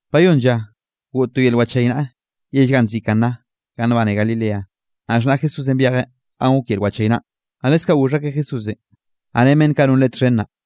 Bayónn lla goꞌt to yel wachaynaꞌa yell ganꞌ nziꞌi Caná ganꞌ nbane Galilea. Naꞌ xhnaꞌ Jesúsenꞌ byejeꞌ ganꞌ gok yel wachaynaꞌn. Naꞌ leskaꞌ goxh akeꞌ Jesúsenꞌ, naꞌ ren beꞌnn kaꞌ non Leꞌen txhen naꞌ.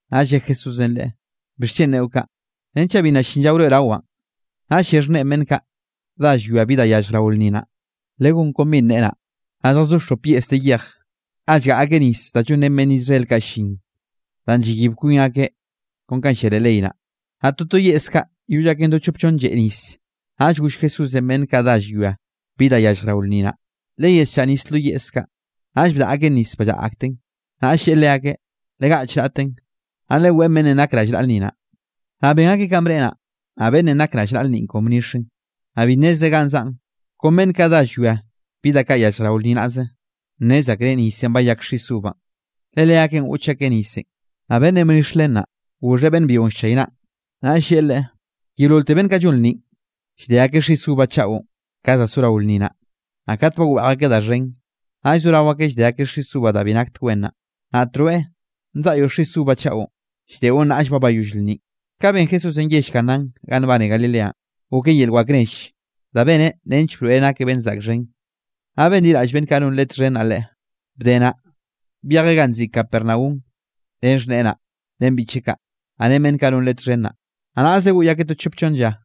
Naꞌll lle Jesúsenꞌ leꞌe: —¿Bixchen neꞌo kaꞌ? Renchaꞌ bi nna llin lla wroeꞌrawaꞌn. Naꞌll lle xhneꞌen beꞌnn kaꞌ dá llwia bi da yallj rao lnni naꞌ: —Legón kon binꞌ neꞌe naꞌ. Naꞌ zjazó xop yeꞌs de yej, ga llgaꞌa akeꞌ nis da llonrén beꞌnn Israel kaꞌ llin da llayib kwin akeꞌ kon kanꞌ llia leꞌ ley naꞌ. Naꞌ toto yeꞌs kaꞌ lloll aken do chop chonn lleꞌ nis. Naꞌll goll Jesúsenꞌ beꞌnn kaꞌ dá llwia bi da yallj rao lnni naꞌ: —Leyesllaꞌa nis lo yeꞌs kaꞌ. Naꞌll bdaꞌa akeꞌn nis ballaꞌa akten. Naꞌll lleꞌe leakeꞌ: —Legaꞌch raꞌtenꞌ, naꞌ leweꞌn beꞌnnenꞌ nak rallnaꞌa lnni naꞌ. Naꞌll ben akeꞌ kanꞌ bneꞌe naꞌ. Naꞌ beꞌnnenꞌ nak rallnaꞌa lnninꞌ kon bnixeꞌn, naꞌ bi nnezreꞌ ga zaꞌn, kon beꞌnn kaꞌ dá llwia bi da kaꞌ yallj rao lnni naꞌze, nnez akreꞌ nisenꞌ bayak xis uvanꞌ, le leakeꞌn goꞌch akeꞌ nisenꞌ. Naꞌ beꞌnnenꞌ bnix len naꞌ, goxheꞌ beꞌnn byionꞌ llchaynaꞌn, naꞌll lleꞌe leꞌe: —Yeololte beꞌnn kaꞌ llon lnninꞌ, llde akeꞌ xis uva chaꞌon ka zorao lnni naꞌ, naꞌ kat ba weꞌj akeꞌ da xhen, naꞌll zorao akeꞌ llde akeꞌ xis uva da bi naktek wen naꞌ. Naꞌt rweꞌ nzaꞌyoꞌ xis uva chaꞌon, lldeꞌon nnaꞌll ba llayoll lnninꞌ. Kaꞌn ben Jesúsenꞌ yell Canánꞌ ganꞌ nbane Galileanꞌ, goken yel wak nell danꞌ beneꞌ nench broeꞌreꞌ nakeꞌ beꞌnn zaꞌk xhen, naꞌ benliraꞌll beꞌnn kaꞌ non Leꞌe txhen naꞌ Leꞌe. Bde naꞌ, byejeꞌ ganꞌ nziꞌi Capernaum ren xhneꞌe naꞌ, ren biꞌcheꞌ kaꞌ, naꞌ ren beꞌnn kaꞌ non Leꞌe txhen naꞌ, naꞌ naꞌze goꞌy akeꞌ to chop chonn lla.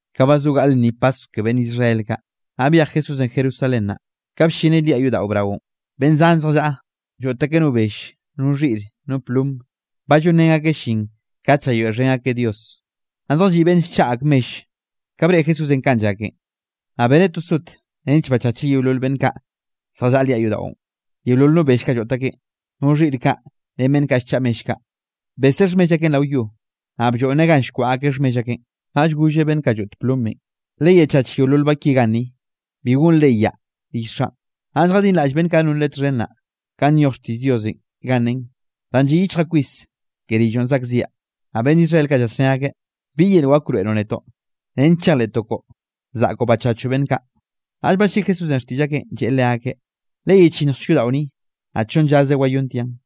Naꞌ ba zo gaꞌl lnni Paskw ke beꞌnn Israel kaꞌ, naꞌ byej Jesúsenꞌ Jerusalén naꞌ. Ka bllineꞌ liaꞌ yodaꞌo braonꞌ, beꞌnn zan zjallaꞌa lloꞌt akeꞌ no bell, no xhiꞌre, no plom, ba llonrén akeꞌ llin kat llayoeꞌxhen akeꞌ Dios, naꞌ zjalliꞌ beꞌnn llchaꞌa ak mell. Ka breꞌe Jesúsenꞌ kanꞌ llaken, naꞌ beneꞌ to sot nench bachacheꞌ yeolol beꞌnn kaꞌ zjallaꞌa liaꞌ yodaꞌon, yeolol no bell kaꞌ lloꞌt akeꞌn, no xhiꞌr kaꞌ ren beꞌnn kaꞌ llchaꞌa mell kaꞌ, beseꞌ xhmell akeꞌn rao yo, naꞌ blloꞌnneꞌ ganꞌ nkwaꞌa akeꞌ xhmell akeꞌn. Naꞌll golleꞌ beꞌnn kaꞌ lloꞌt plomenꞌ: —Leyechach yeolol ba ki ganni. Bi gonre yaꞌa rill Xaꞌn. Naꞌll jadinraꞌll beꞌnn kaꞌ non Leꞌe txhen naꞌ, kanꞌ nyoj xtiꞌll Diosenꞌ ganꞌ nen: “Danꞌ lliꞌ yichjaꞌ kwis ke rilloꞌn zaꞌkziaꞌ.” Naꞌ beꞌnn Israel kaꞌ llasné akeꞌ: —¿Bi yel wak wroeꞌroꞌ netoꞌ, nench chejleꞌtoꞌ koꞌo zaꞌkoꞌ bachachoꞌ beꞌnn kaꞌ? Naꞌll balliꞌi Jesúsenꞌ xtiꞌll akeꞌn, lleꞌe leakeꞌ: —Leyechinnjchek yodaꞌo ni, naꞌ chonn llaze wayontiaꞌn.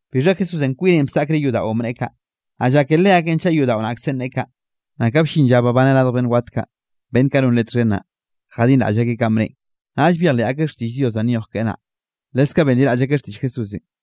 Bixha Jesúsenꞌ kwineꞌn bsaꞌkreꞌ yodaꞌon bneꞌe kaꞌ, naꞌ llake leakeꞌn chaꞌ yodaꞌo naꞌkzenꞌ neꞌe kaꞌ. Naꞌ ka bllin lla babaneꞌ radj beꞌnn wat kaꞌ, beꞌnn kaꞌ non Leꞌe txhen naꞌ, jadinraꞌll akeꞌ kanꞌ bneꞌen, naꞌll byejleꞌ akeꞌ xtiꞌll Diosenꞌ danꞌ nyoj keꞌe naꞌ, leskaꞌ benliraꞌll akeꞌ xtiꞌll Jesúsenꞌ.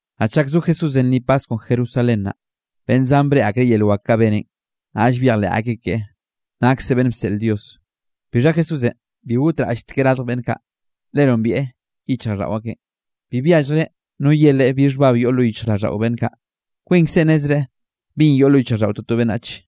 Naꞌ chak zo Jesúsenꞌ lnni Paskwnꞌ Jerusalén naꞌ, beꞌnn zan breꞌe akreꞌ yel wak kaꞌ beneꞌn, naꞌll byejleꞌ akeꞌ keꞌe, nakseꞌ beꞌnn bseꞌl Dios. Bixha Jesúsenꞌ bi gotraꞌlltekeꞌ radj beꞌnn kaꞌ, le nombieꞌ yichjraꞌlldaꞌo akeꞌn. Bi byalljreꞌ no ye Leꞌe bi xhbab yoꞌ lo yichjraꞌlldaꞌo beꞌnn kaꞌ. Kwinkzeꞌ nnezreꞌ binꞌ yoꞌ lo yichjraꞌlldaꞌo toto beꞌnnach.